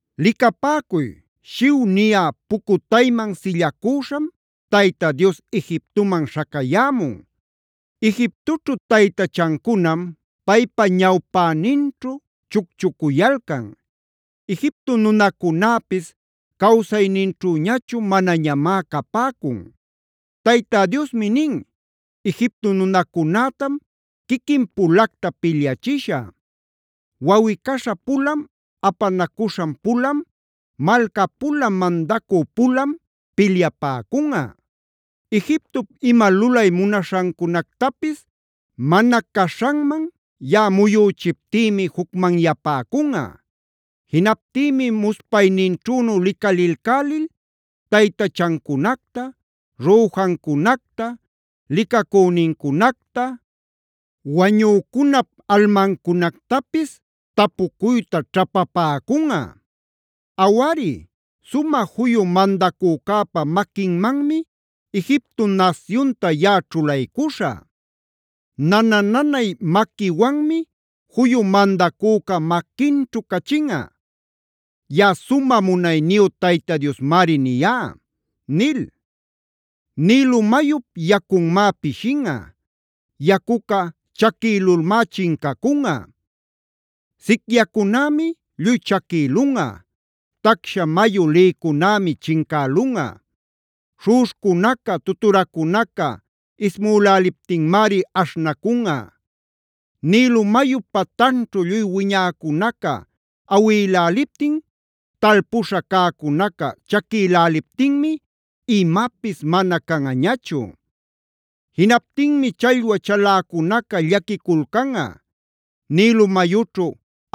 Licapäcuy, “shiw” niyä pucutayman sillacüśham, Tayta Dios Egiptoman śhacayämun. Egiptoćhu taytachancunam paypa ñawpäninćhu chucchucuyalcan; Egipto nunacunäpis cawsayninćhüñachu manañamá capäcun. Tayta Diosmi nin: “Egipto nunacunätam quiquin-pulacta pilyachishä. Wawꞌi-caśha-pulam, apanacuśhan-pulam, malca-pulam, mandacü-pulam pilyapäcunꞌa. Egiptop ima lulay munaśhancunactapis mana caśhanman yaꞌa muyüchiptïmi jucmanyapäcunꞌa. Jinaptïmi muspayninćhünu licalilcälil taytachancunacta, rüjancunacta, licacünincunacta, wañücunap almancunactapis tapucuyta ćhapapäcunꞌa. Awari, sumä juyu mandacücäpa maquinmanmi Egipto nasyunta yaꞌa ćhulaycuśhä. Nana-nanay maquiwanmi juyu mandacüca maquinćhu cachinꞌa. Yaꞌa sumä munayniyu Tayta Diosmari niyá” nil. Nilo mayup yacunmá pishinꞌa; yacuca chaquïlulmá chincacunꞌa. Sicyacunämi lluy chaquïlunꞌa; tacsha mayu lïcunämi chincälunꞌa; śhuꞌuśhcunaca, tuturacunaca ismüläliptinmari aśhnacunꞌa. Nilo mayup patanćhu lluy wiñäcunaca awïläliptin, talpuśha cäcunaca chaquïläliptinmi imapis mana canꞌañachu. Jinaptinmi challwa chaläcunaca llaquiculcanꞌa; Nilo mayućhu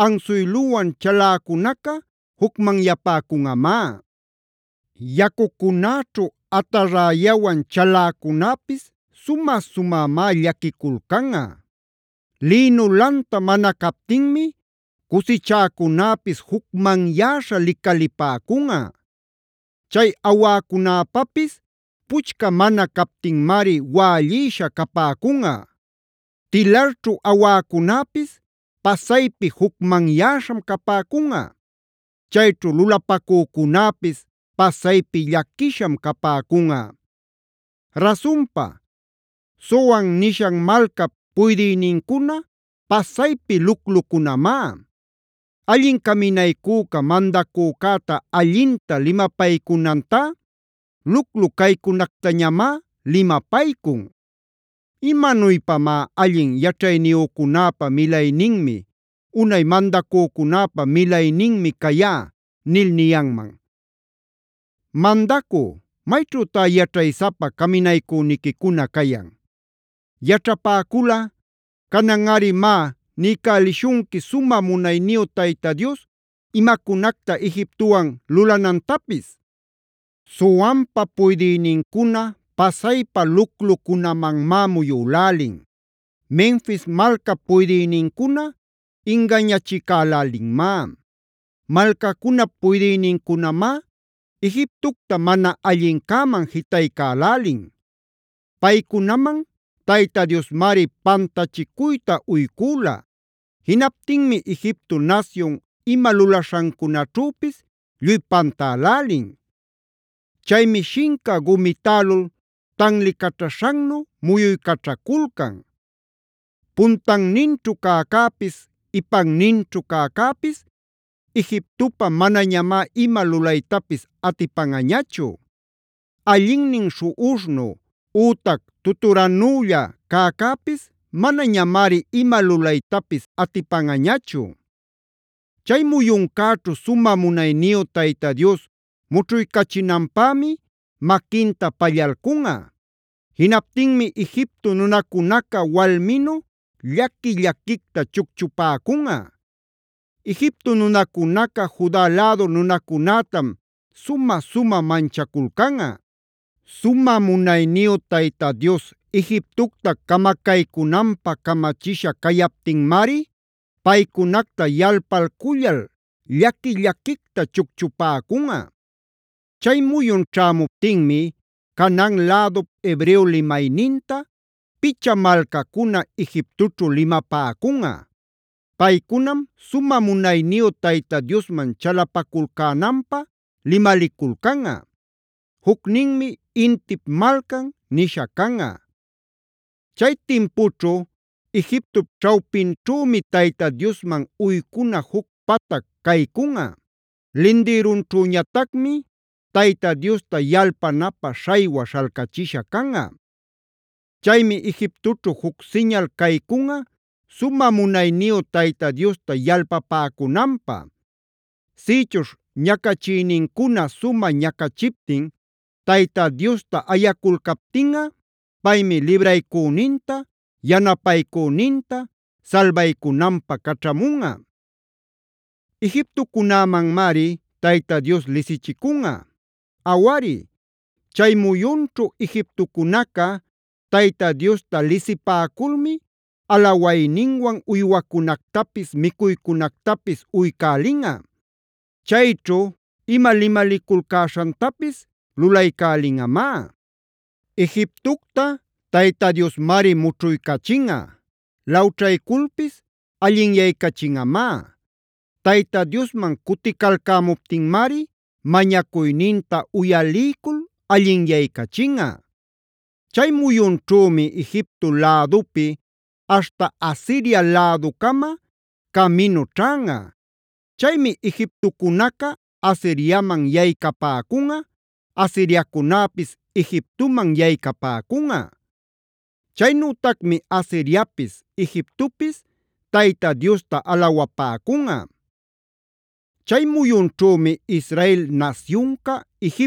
ansuyluwan chaläcunaca jucmanyapäcunꞌamá; yacucunäćhu atarräyawan chaläcunäpis sumä sumämá llaquiculcanꞌa. Lïnu lanta mana captinmi cusichäcunäpis jucmanyäśha licalipäcunꞌa; chay awäcunäpäpis puchca mana captinmari wällïsha capäcunꞌa. Tilarćhu awäcunäpis pasaypi jucmanyäśham capäcunꞌa; chayćhu lulapacücunäpis pasaypi llaquisham capäcunꞌa. Rasunpa, Zoan nishan malcap puydïnincuna pasaypi luclucunamá. Allin caminaycüca mandacücäta allinta limapaycunantá, luclu caycunactañamá limapaycun. ¿Imanuypamá “Allin yaćhayniyücunäpa milayninmi; unay mandacücunäpa milayninmi cayá” nil niyanman? Mandacü, ¿mayćhütá yaćhaysapa caminaycüniquicuna cayan? Yaćhapäculꞌa, cananꞌari má, niycälishunqui sumä munayniyu Tayta Dios imacunacta Egiptowan lulanantapis. Zoanpa puydïnincuna pasaypa luclucunamanmá muyülälin; Menfis malcap puydïnincuna ingañachicälälinmá; malcacunap puydïnincunamá Egiptocta mana allincäman jitaycälälin. Paycunaman Tayta Diosmari pantachicuyta uycüla. Jinaptinmi Egipto nasyun ima lulaśhancunäćhüpis lluy pantälälin. Chaymi shinca gumitälul tanlicaćhaśhannu muyuycaćhaculcan. Puntanninćhu cäcäpis ipanninćhu cäcäpis Egiptopä manañamá ima lulaytapis atipanꞌañachu; allinnin śhuꞌuśhnu ütac tuturanülla cäcäpis manañamari ima lulaytapis atipanꞌañachu. Chay muyuncäćhu sumä munayniyu Tayta Dios mućhuycachinanpämi maquinta pallalcunꞌa. Jinaptinmi Egipto nunacunaca walminu llaqui-llaquicta chucchupäcunꞌa. Egipto nunacunaca Juda lädu nunacunätam sumä-sumä manchaculcanꞌa. Sumä munayniyu Tayta Dios Egiptocta camacaycunanpä camachisha cayaptinmari paycunacta yalpalcullal llaqui-llaquicta chucchupäcunꞌa. Chay muyun ćhämuptinmi Canaan lädup hebreo limayninta, picha malcacuna Egiptoćhu limapäcunꞌa. Paycunam sumä munayniyu Tayta Diosman chalapaculcänanpä limaliculcanꞌa. Jucninmi Intip Malcanb nisha canꞌa. Chay timpućhu Egiptop ćhawpinćhümi Tayta Diosman uycuna juc patac caycunꞌa. Lindïrunćhüñatacmi Tayta Diosta yalpanapä śhaywa śhalcachisha canꞌa. Chaymi Egiptoćhu juc siñal caycunꞌa sumä munayniyu Tayta Diosta yalpapäcunanpä. Sïchuśh ñacachïnincuna sumä ñacachiptin Tayta Diosta ayaculcaptinꞌa, paymi libraycüninta, yanapaycüninta salbaycunanpä caćhamunꞌa. Egiptocunämanmari Tayta Dios lisichicunꞌa. Awari, chay muyunćhu Egiptocunaca Tayta Diosta lisipäculmi alawayninwan uywacunactapis, micuycunactapis uycälinꞌa. Chayćhu ima limaliculcäśhantapis lulaycälinꞌamá. Egiptocta Tayta Diosmari mućhuycachinꞌa; lawćhayculpis allinyaycachinꞌamá. Tayta Diosman cuticalcämuptinmari mañacuyninta uyaliycul allinyaycachinꞌa. Chay muyunćhümi Egipto lädupi aśhta Asiria läducama caminu ćhanꞌa. Chaymi Egiptocunaca Asiriaman yaycapäcunꞌa; Asiriacunäpis Egiptoman yaycapäcunꞌa. Chaynütacmi Asiriapis, Egiptopis Tayta Diosta alawapäcunꞌa. Chay muyunćhümi Israel nasyunca,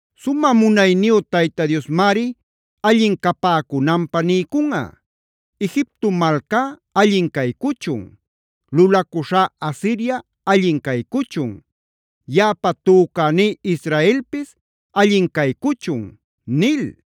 Sumä munayniyu Tayta Diosmari allin capäcunanpä niycunꞌa: “Egipto malcá allin caycuchun; lulacuśhá Asiria allin caycuchun; yaꞌapa tücäní Israelpis allin caycuchun” nil.